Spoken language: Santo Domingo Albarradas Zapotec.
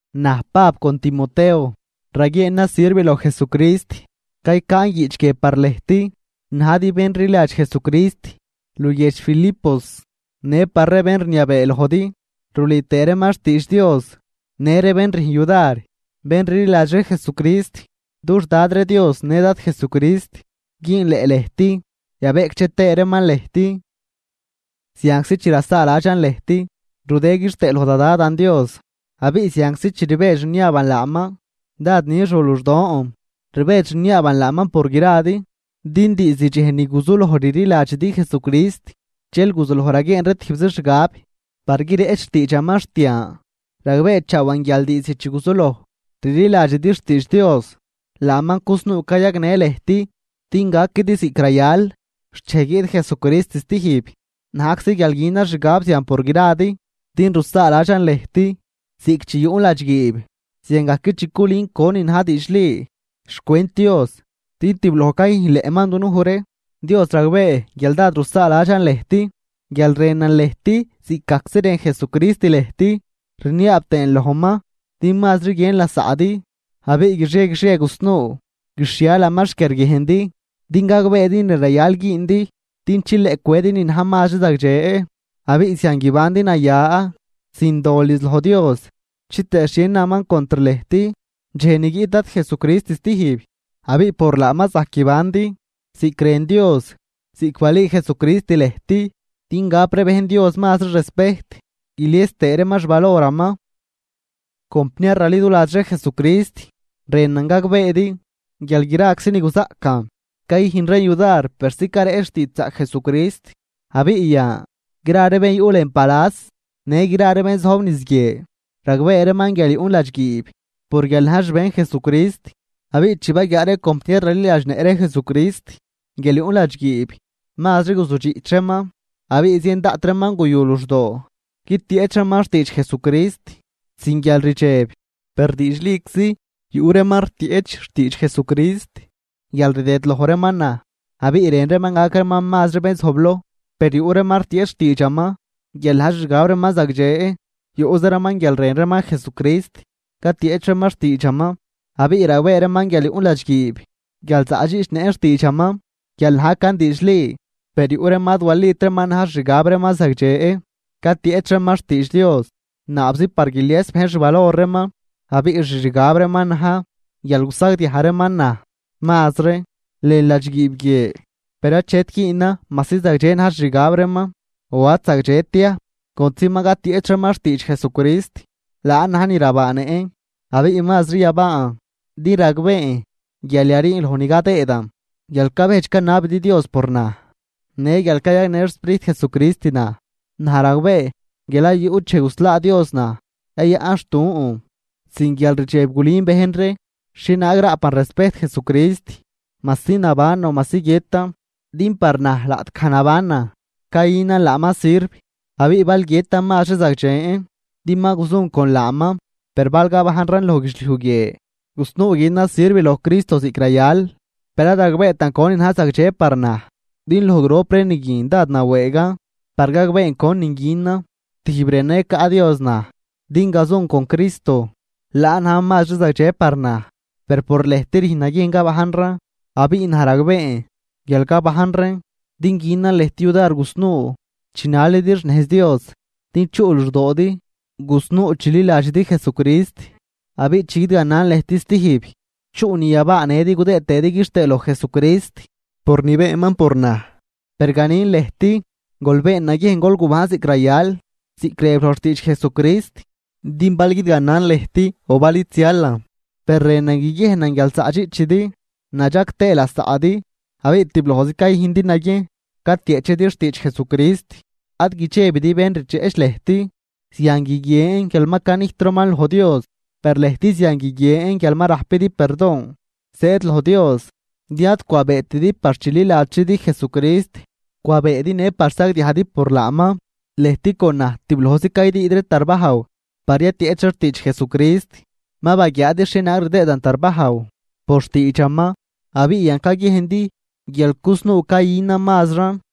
Naj Pab con Timoteo, raguieenan sirv loj Jesucrist. Caycaan guiꞌch guie par lëjt najdi bén rliladx Jesucrist luguiedx Filipos, në par ree bén rniabee lojdi rulüü tëë reeman xtiidx Dios në ree bén rüjn yudar bén rliladx ree Jesucrist. Dux Dad ree Dios në Dad Jesucrist güünleꞌ lëjt, yabeꞌcdxe tëë reeman lëjt. Zianczi chi rasaaladxan lëjt, rudën quixtëë loj da Dadan Dios. Abiꞌ zianczi chi rbedx rniaaban laaman dád nix ru luxdon, rbedx rniaaban laaman por gradi. Din diizd dxej ni guzuloj rliladxidi Jesucrist dxel guzuloj raguieen ree tijbzi xgab par guireꞌch xtiidxaman xt yan. Ragbeechaawan guial diizd chi guzuloj rliladxidi xtiidx Dios, laaman cusnuu cayagnë lëjt din gaquidi ziꞌc rayal xt dxej guiꞌt Jesucrist stijb. Najczi guial günan xgab zian por gradi, din rusaaladxan lëjt, ziꞌc chi yuꞌn ladxguiib ziangajc chi culün conin na̱j diidxli xcwent Dios din tibloj cayüjnleꞌman dunuj ree. Dios ragbee guial dád rusaaladxan lëjt guial rënan lëjt ziꞌcgajczi rën Jesucrist lëjt. Rniaab tëën lojman din mazri guiën lasaꞌdi, abiꞌ guixie guixie gusnuu guixhialaman xquiarguiejndi din gagbeedi ni rayal güündi, din chileꞌ cwedi ni na̱j mazri zagdxe. Abiꞌ zian guibandi naya sin dol niz loj Dios, chitëë xhie naman contr lëjt dxej ni guiꞌt Dad Jesucrist stijb. Abiꞌ por laaman zajc guibandi ziꞌc rën Dios ziꞌc balüü Jesucrist lëjt din gap ree bejn Dios mazri respejt guilies tëë reeman xvaloraman. Compniar raliduladx ree Jesucrist, rënan gagbeedi guial graczi ni guzaꞌcan cayüjn reen yudar persi careꞌch xtiidxzaꞌc Jesucrist. Abiꞌ yan, gra ree bén yuꞌ lën palas në gra ree bén zojb niz guie ragbee reeman guial yuꞌn ladxguiib por guial najn xbejn Jesucrist. Abiꞌ chi baguiaa ree compniar raliladxnëꞌ ree Jesucrist guial yuꞌn ladxguiib, mazri guzudxiꞌch reeman abiꞌ zien daꞌt reeman guyu luxdoo guitieꞌch reeman xtiidx Jesucrist sin guialrdxeb. Per diidxliczi yuꞌ reeman rtieꞌch xtiidx Jesucrist guial rdëdloj reeman naj abiꞌ rën reeman gac reeman mazri bén zojbloj. Per yuꞌ reeman rtieꞌch xtiidxaman guial na̱j xixgab reeman zagdxe. Yuꞌza reeman guial rën reeman Jesucrist, catieꞌch reeman xtiidxaman abiꞌ ragbee reeman guial yuꞌn ladxguiib guial zaꞌdxiꞌchnëꞌn xtiidxaman guial najcan diidxli. Per yuꞌ reeman ad walit reeman na̱j xixgab reeman zagdxe catieꞌch reeman xtiidx Dios, naabzi par guilies bejn xvalor reeman abiꞌ xixgab reeman na̱j guial gusagdiaj reeman naj mazri lën ladxguiib guie. Per achet güünan majsi zagdxe na̱j xixgab reeman o ad zagdxet ya, contzi ma catieꞌch reeman xtiidx Jesucrist, laan na̱j ni rabaanëꞌn abiꞌ mazri yabaan. Din ragbeen guial yariin loj ni cadëëdan guial cabejdx canabidi Dios por naj në guial cayagnë xSprijt Jesucrist naj. Naj ragbee guial ad yuꞌt dxej guslaa Dios naj yayaꞌnxtun, sin guialrdxeb gulün bejn ree xhienaag raꞌpan respejt Jesucrist majsi nabanan o majsi guiëtan. Din par naj laꞌtgaj nabanan cayünan laaman sirv, abiꞌ bal guiëtan mazri zagdxen din ma gazun con laaman. Per bal gabajnran loj guidxliuj guie, gusnuu günan sirv loj Cristo ziꞌc rayal, per ad ragbeetan conin na̱j zagdxe par naj. Din loj grop ree ni guin dád nawëëgan par gaben conin günan, tijb rënan yacaꞌ Dios naj din gazun con Cristo, laan na̱j mazri zagdxe par naj, per por lëjt rüjn naguiejn gabajnran. Abiꞌ naj ragbeen guial gabajnran din günan lëjt yudar gusnuu chinalidi xnejz Dios, din chuꞌ luxdoodi gusnuu chililadxidi Jesucrist. Abiꞌ chi guidganan lëjt stijb, chuꞌ ni yabaanëdi gudëë tëëdi quixtëë loj Jesucrist por ni beenman por naj. Per ganin lëjt, gol been naguiejn gol gubajn ziꞌc rayal, ziꞌc rëb loj xtiidx Jesucrist. Din bal guidganan lëjt o bal id zialan, per rënan guiguiejnan guial zaꞌdxiꞌchidi nadxag tëë lasaꞌdi abiꞌ tiblojz cayüjndi naguiejn catieꞌchidi xtiidx Jesucrist. Ad guidxebidi bén rdxeꞌch lëjt. Zian guiguien guial ma canijt reeman loj Dios, per lëjt zian guiguien guial ma rajpidi perdon zëëd loj Dios. Din ad cwabeetidi par chililadxzidi Jesucrist, cwabeedi në par sagdiajdi por laaman. Lëjt con naj tiblojz caydüüd ree tarbajw par yatieꞌch ree xtiidx Jesucrist, ma baguiaadi xhienaag rdëëdan tarbajw por xtiidxaman abiꞌ yan caguiejndi guial cusnuu cayünan mazran.